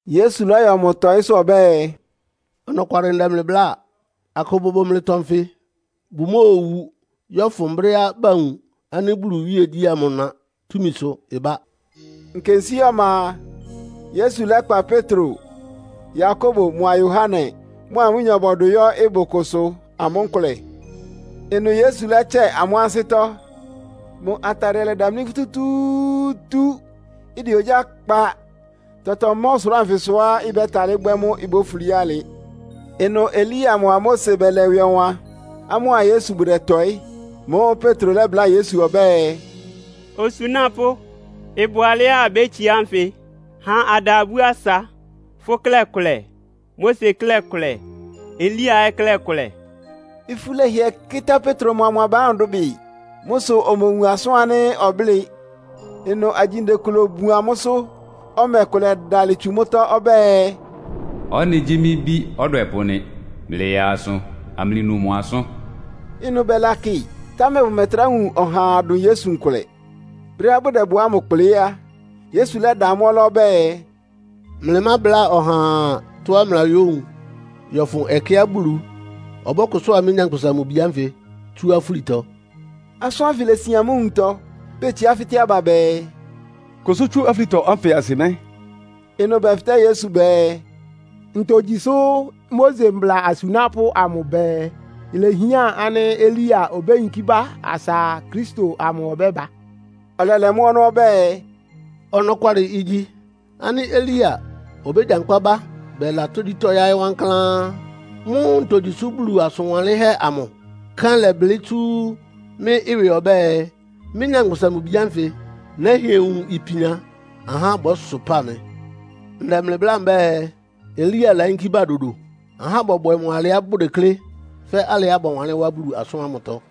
Yesu lɔ́yɔ mʋ tɔ́ɩsʋ ɔbɛ́ɛ, “Ɔnɔkwalɩ ndɛ mlɩ bláa. Akʋ bʋbʋ mlɩtɔ nfɩ bʋmóowu, yɔ́fʋn brɛ́á bawun ánɩ́ Bulu iwíegyí amʋ ɩna túmisʋ ɩbá.” Nkensíé ɔma a, Yesu lɛ́kpa Petro, Yakobo mʋa Yohane, mʋa amʋ́nyɔ bɔdʋ yɔ́ ɩbʋ kʋsʋ amʋ́ nkʋlɛ. Ɩnʋ Yesu lɛ́tsɛ amʋ́ ansɩ́tɔ́. Mʋ atadɩɛ lɛdamlí futútúútú, ɩdɛ ogyá kpa. Tɔtɔ ma ɔsʋlʋ́ʋ anfɩsʋá ɩbɛ́talɩ́ bwɛ́ mʋ́ ibófulí alɩ. Ɩnʋ Elia mʋa Mose bɛlɛ ɩwɩ ɔwan, amʋ́a Yesu bʋdɛtɔɩ́. Mʋ́ʋ́ Petro lɛ́bláa Yesu ɔbɛ́ɛ, “Osunápʋ́, ɩbʋ alɛ́á abétsiá nfɩ. Ha ada abú asa. Fʋ́ klɛ́ kʋlɛ, Mose klɛ́ kʋlɛ, Elia ɛ́ klɛ́ kʋlɛ.” Ifú lɛhɩɛ kɩ́tá Petro mʋa mʋ aba ámʋ dʋbɩ. Mʋ́ sʋ omowun asʋ́n ánɩ́ ɔblɩ́ɩ. Ɩnʋ agyinde kʋ lobobun amʋ́sʋ́, ɔmɛ kʋ lɛdalɩ tsu mʋ́tɔ́ ɔbɛ́ɛ, “Ɔ́nɩ gyí mɩ́ Bí ɔdwɛpʋ́ nɩ́! Mlɩyaa asʋ amlɩnu mʋ asʋ́n!” Ɩnʋ bɛlakɩ, támɛ bʋmɛtrá wun ɔhaa dʋn Yesu nkʋlɛ. Brɛ́á bʋdɛ ɩbʋ ámʋ kplɩ́ á, Yesu lɛ́da amʋ́ ɔlá ɔbɛ́ɛ, “Mábláa ɔhaa tɔ́á bayówun, yɔ́fʋn ɛkɛá Bulu ɔbɔ́kʋsʋ́a mɩ́, Nyankpʋsa-Mʋ-Bi ánfɩ tsú afúlitɔ.” Asʋ́n ánfɩ lesin amʋ́ nwuntɔ, betsiá fɩ́tɛ́ aba bɛɛ, “Kʋsʋ́ tsú afúlitɔ ánfɩ asɩ mɛ́?” Ɩnʋ bɛfɩtɛ́ Yesu bɛɛ, “Ntogyi sʋ́ Mose mbla asunápʋ́ amʋ bɛɛ, ilehián ánɩ́ Elia obéyinkí bá asa Kristo amʋ ɔbɛ́ba?” Ɔlɛlɛ mʋ́ ɔnɔ́ ɔbɛ́ɛ, “Ɔnɔkwalɩ igyi, ánɩ́ Elia obégyankpá bá bɛla tógyítɔ́ yáɩ́ wankláán. Mʋ́ ntogyi sʋ́ Bulu asʋn wanlɩ́nhɛ́ amʋ kɛ́n lɛ́blɩ́ tsú mɩ́ ɩwɩ ɔbɛ́ɛ, mɩ́, Nyankpʋsa-Mʋ-Bi ánfɩ nɛ́hɩɛ wun ipian, ahá bɔ́sʋpáa mɩ? Ndɛ mlɩ bláa mbɛ́ɛ, Elia layínkí bá dodo. Ahá bɔbwɛ mʋ alɩá bʋdeklé, fɛ́ alɩá bɔwanlɩ́n wá Bulu asʋ́n ámʋtɔ.”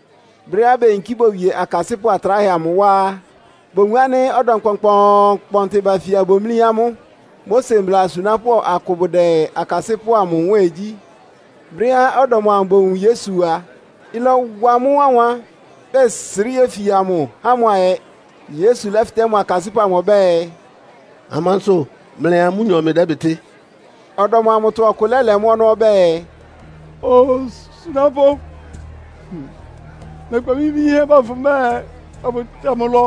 Brɛ́á beyinkí bowie akasɩ́pʋ́ atráhɛ amʋ wá á, bowun ánɩ́ ɔdɔm kpɔnkpɔɔnkpɔntɩ bafia bomlí amʋ́, Mose mbla asunápʋ́ akʋ bʋdɛ akasɩ́pʋ́ amʋ nwɛ́ɛn gyí. Brɛ́á ɔdɔm amʋ bowun Yesu a, ɩlɔwa amʋ́ wánwan, bɛsrɩ́ yéfia mʋ, há mʋ ayɛ. Yesu lɛ́fɩtɛ́ mʋ akasɩ́pʋ́ amʋ ɔbɛ́ɛ, “Amansʋ mlɩa amʋ́nyɔ mlɩdɛ́bɩtɩ́?” Ɔdɔm amʋtɔ ɔkʋ lɛ́lɛ mʋ́ ɔnɔ́ ɔbɛ́ɛ, “Osunápʋ́, nɛkpa mɩ́ bí yínhɛ́ ba fʋ mbɛ́ɛ afʋtsa mʋ ɩlɔ.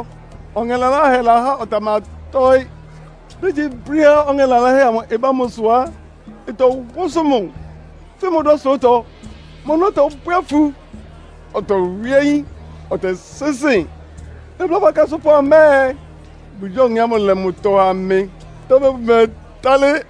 Ɔŋɛ laláhɛ lahá ɔtamatɔ́ɩ́. Brégyíbrɛ́á ɔŋɛ laláhɛ amʋ ɩba mʋsʋ á, ɩtɔwʋ́sʋ mʋ, fɩn mʋ dá ɔsʋlʋ́tɔ. Mʋ ɔnɔ́ tɔbwɛ́ afu, ɔtɔwɩ́ ayín, ɔtɛsɩ́nsɩn. Nɛbláa fʋ́ akasɩ́pʋ́ mbɛ́ɛ, bʋgyáa ɔŋɛ́ ámʋ lɛ mʋtɔ ha mɩ, támɛ bʋmɛtalɩ́.”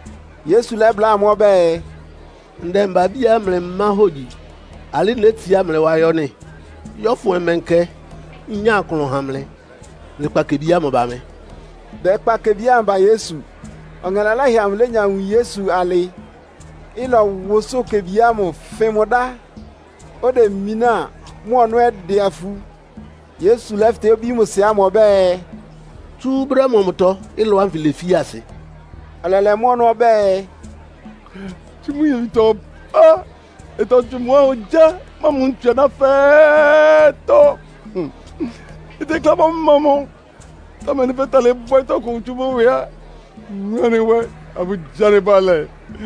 Yesu lɛ́bláa amʋ́ ɔbɛ́ɛ, “Ndɛmba-abíá mlɩmá hógyi, alɩ́ nétsiá mlɩ wá yɔ́ nɩ́? Yɔ́fʋn ɔmɛnkɛ nnyá klʋn ha mlɩ? Mlɩkpa kebi ámʋ ba mɩ!” Bɛkpa kebi ámʋ ba Yesu. Ɔŋɛ laláhɛ amʋ lénya wun Yesu alɩ, ɩlɔwʋsʋ́ʋ kebi ámʋ fɩn mʋ dá. Odemináa, mʋ ɔnɔ́ ɛ́ ɩdɛ afu. Yesu lɛ́fɩtɛ́ obí mʋ sɩ ámʋ ɔbɛ́ɛ, “Tsú brɛ́ mɔmʋtɔ ɩlɔ ánfɩ lefi asɩ?” Ɔlɛlɛ mʋ́ ɔnɔ́ ɔbɛ́ɛ, “Tsú mʋ nyebitɔ ɔpá. Ɩtɔtswɩ mʋ wá ogyá mʋ́a ntsu aná fɛ́ɛ́tɔ́, itekleá ɩbɔ́mɔ mʋ, támɛ nɩ́ fɛ́talɩ́ bwɛ́ tɔkʋ tsú mʋ́ ɩwɩ á, wun anɩ nwɛ afʋgyi anɩ bʋalɛ.”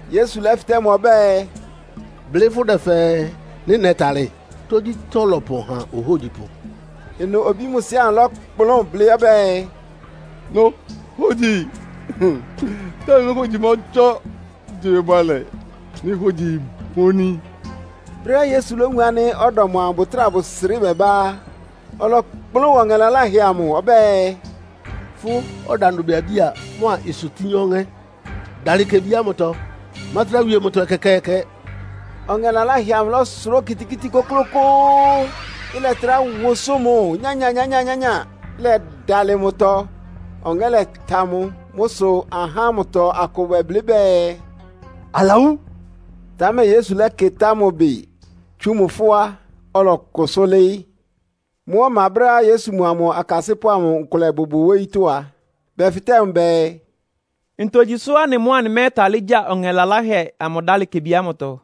Yesu lɛ́fɩtɛ́ mʋ ɔbɛ́ɛ, “Blɩ́ fʋdɛ fɛɛ, nɩ́ nɛ́talɩ́? Tógyítɔ́ lɔpɔn ha ohógyipʋ.” Ɩnʋ obí mʋ sɩ ámʋ lɔ́kplʋn blɩ́ ɔbɛ́ɛ, “Nohogyi, támɛ mɩ́ hógyi mɔtsɔ́. Gyi mɩ bʋalɛ, mɩ́ hógyi imoní!” Brɛ́á Yesu lówun ánɩ́ ɔdɔm amʋ bʋtráa bʋsrɩ́ bɛbá á, ɔlɔkplʋ́n wa ɔŋɛ laláhɛ amʋ ɔbɛ́ɛ, “Fʋ́ ɔdandʋbiabía mʋ́a ɩsʋtín ɔŋɛ́, dalɩ kebi ámʋtɔ. Mátrá wie mʋtɔ ɛkɛkɛɛkɛ!” Ɔŋɛ laláhɛ amʋ lɔ́sʋrá okitikíti kʋ́klʋ́kʋ́ʋ́, ɩlɛtrá wʋsʋ́ʋ mʋ nyányányányáa, ɩlɛdalɩ mʋtɔ. Ɔŋɛ́ lɛta mʋ. Mʋ́ sʋ ahá ámʋtɔ akʋ bɛblɩ́ bɛɛ, “Alawú.” Támɛ Yesu lɛ́kɩtá mʋ ɩbɩ tsú mʋ fʋ́á, ɔlɔkʋsʋ́ lɩ́ɩ́. Mʋ́ ɔma, brɛ́á Yesu mʋa mʋ akasɩ́pʋ́ amʋ nkʋlɛ bʋbʋ wóyítɔ́ a, bɛfɩtɛ́ mʋ bɛɛ, “Ntogyi sʋ́ anɩ mʋ́ anɩmɛ́talɩ́ gya ɔŋɛ laláhɛ amʋ dálɩ kebi ámʋtɔ?”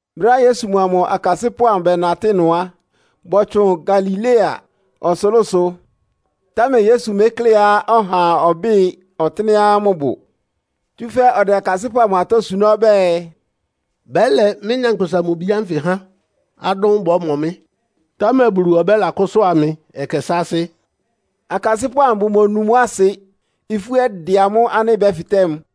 Brɛ́á Yesu mʋa mʋ akasɩ́pʋ́ amʋ bɛnatɩ́ ɩnʋ á, bɔtsʋn Galilea ɔsʋlʋ́sʋ, támɛ Yesu mékléá ɔhaa ɔbɩ́ɩ ɔtɩ́nɛ́á mʋbʋ. Tsúfɛ́ ɔdɛ akasɩ́pʋ́ amʋ atɔ́ suná ɔbɛ́ɛ, “Bɛ́lɛ mɩ́, Nyankpʋsa-Mʋ-Bi ánfɩ há adʋ́n bɔ́mɔ mɩ́, támɛ Bulu ɔbɛ́lakʋ́sʋ́a mɩ ɛkɛ sáásɩ́.” Akasɩ́pʋ́ amʋ bʋmonu mʋ́ asɩ, ifú ɛ́ dɛ amʋ́ ánɩ́ bɛfɩtɛ́ mʋ.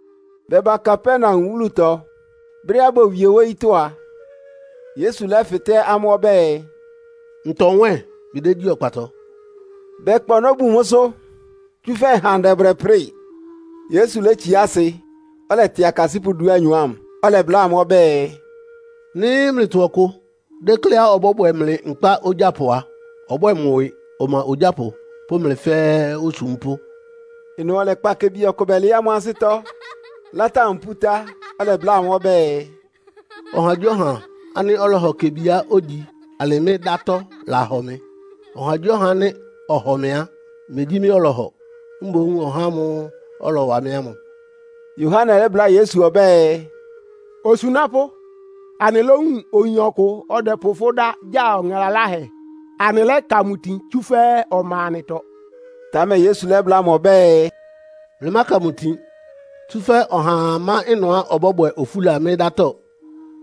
Bɛba Kapernaum wúlutɔ. Brɛ́á bowie wóyítɔ́ á, Yesu lɛ́fɩtɛ́ amʋ́ ɔbɛ́ɛ, “Ntɔ nwɛ́ɛn mlɩdégyí ɔkpatɔ?” Bɛkpa ɔnɔ́ bun mʋ́sʋ́, tsúfɛ́ ɩhandɛ bʋdɛprɩ́ɩ. Yesu létsiá asɩ, ɔlɛtɩ akasɩ́pʋ́ dúanyɔ ámʋ, ɔlɛbláa amʋ́ ɔbɛ́ɛ, “Nɩ́ mlɩtɔ ɔkʋ dékléá ɔbɔ́bwɛ mlɩ nkpá ogyápʋ a, ɔbwɛ́ɛ mʋ ɩwɩ ɔma ogyápʋ pʋ́ mlɩ fɛ́ɛ́ osúmpʋ́.” Ɩnʋ ɔlɛkpa kebi ɔkʋ bɛlɩɩ́ amʋ́ ansɩ́tɔ́, látá mʋ pútá, ɔlɛbláa amʋ́ ɔbɛ́ɛ, “Ɔhagyíɔha ánɩ́ ɔlɔhɔ kebiá ogyi alɩ mɩ́ dátɔ́ lahɔ mɩ. Ɔhagyíɔha ánɩ́ ɔhɔ mɩ á, megyí mɩ́ ɔlɔhɔ, mboún ɔhá ámʋ́ʋ́ ɔlɔwa mɩ́ ámʋ.” Yohane lɛ́bláa Yesu ɔbɛ́ɛ, “Osunápʋ́, anɩlówun oyin ɔkʋ dɛ́pʋ fʋ́ dá gya ɔŋɛ laláhɛ, anɩlɛ́ka mʋ tin, tsúfɛ́ ɔma anɩtɔ.” Támɛ Yesu lɛ́bláa amʋ́ ɔbɛ́ɛ, “Mlɩmáka mʋ itin! Tsúfɛ́ ɔhaa má ɩnʋá ɔbɔ́bwɛ ofúla mɩ́ dátɔ́,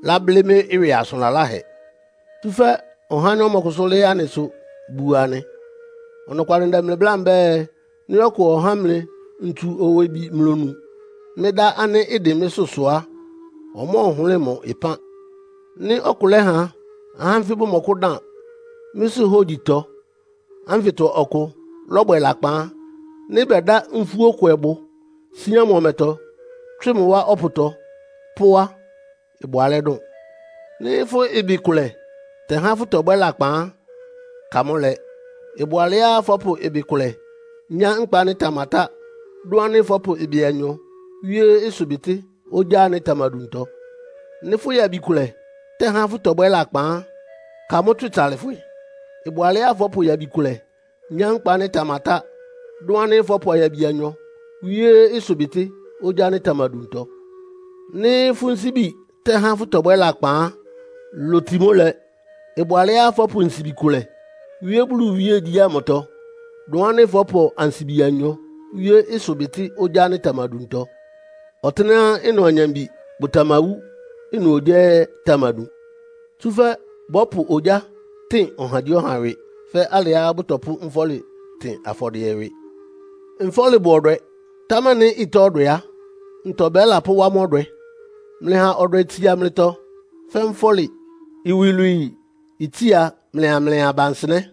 láblɩ́ mɩ́ ɩwɩ asʋn laláhɛ. Tsúfɛ́ ɔhá ánɩ́ ɔmɔkʋsʋ́ lɩ́ɩ́ anɩsʋ buo anɩ. Ɔnɔkwalɩ ndɛ mlɩ bláa mbɛ́ɛ, nɩ́ ɔkʋ ɔhá mlɩ ntsu-owebi mlonu, mɩ́ dá ánɩ́ ɩdɩn mlɩsʋ sʋ á, ɔmɔ́ɔhʋlɩ́ɩ mʋ ɩpán. “Nɩ́ ɔkʋ lɛ́ha ahá ánfɩ bʋmɔkʋ́dan mɩ́sʋ́ hógyitɔ ánfɩtɔ ɔkʋ lɔ́bwɛ lakpan á, nɩ́ bɛda nfúókwɛbʋ síán mʋ ɔmɛtɔ, tswɩ mʋ wá ɔpʋtɔ pó á, ɩbʋ alɛ́ dʋn. Nɩ́ fʋ́ ɩbɩ kʋlɛ tɛ́há fʋ́tɔbwɛ́ lakpan á, ka mʋ́ lɛ! Ɩbʋ alɛ́á fɔ́pʋ ɩbɩ kʋlɛ nyá nkpa ánɩ́ ɩtamatá, dʋn ánɩ́ fɔ́pʋ ɩbɩ anyɔ wíé ɩsʋbɩtɩ́ ogyá ánɩ́ ɩtamaduntɔ. Nɩ́ fʋ́ yabi kʋlɛ tɛ́há fʋ́tɔbwɛ́ lakpan á, ka mʋ́ tswɩ tsalɩfwɩ! Ɩbʋ alɛ́á fɔ́pʋ yabi kʋlɛ nyá nkpa ánɩ́ ɩtamatá, dʋn ánɩ́ fɔ́pʋ ayabi anyɔ wíé ɩsʋbɩtɩ́ ogyá ánɩ́ ɩtamaduntɔ. Nɩ́ fʋ́ nsíbi tɛ́há fʋ́tɔbwɛ́ lakpan á, loti mʋ́ lɛ. Ɩbʋ alɛ́á fɔ́pʋ nsibi kʋlɛ wíé Bulu iwíegyí ámʋtɔ, dʋn ánɩ́ fɔ́pʋ ansibi anyɔ wíé ɩsʋbɩtɩ́ ogyá ánɩ́ ɩtamaduntɔ. Ɔtɩ́nɛ́á ɩnʋ anyambi bʋtamawú, ɩnʋ ogyá ɛ́ ɩtamadun. “Tsúfɛ́ bɔ́pʋ ogyá tɩn ɔhagyíɔha ɩwɩ, fɛ́ alɩá bʋtɔpʋ́ nfɔ́lɩ tɩn afɔdɩɛ ɩwɩ. “Nfɔ́lɩ bʋ ɔdwɛ, támɛ nɩ́ ɩtá ɔdwɛ á, ntɔ bɛ́lapʋ́wá mʋ́ ɔdwɛ? “Mlɩha ɔdwɛ itsia mlɩtɔ fɛ́ nfɔ́lɩ, iwilwii itsia mlɩa mlɩ aba nsɩnɛ́.”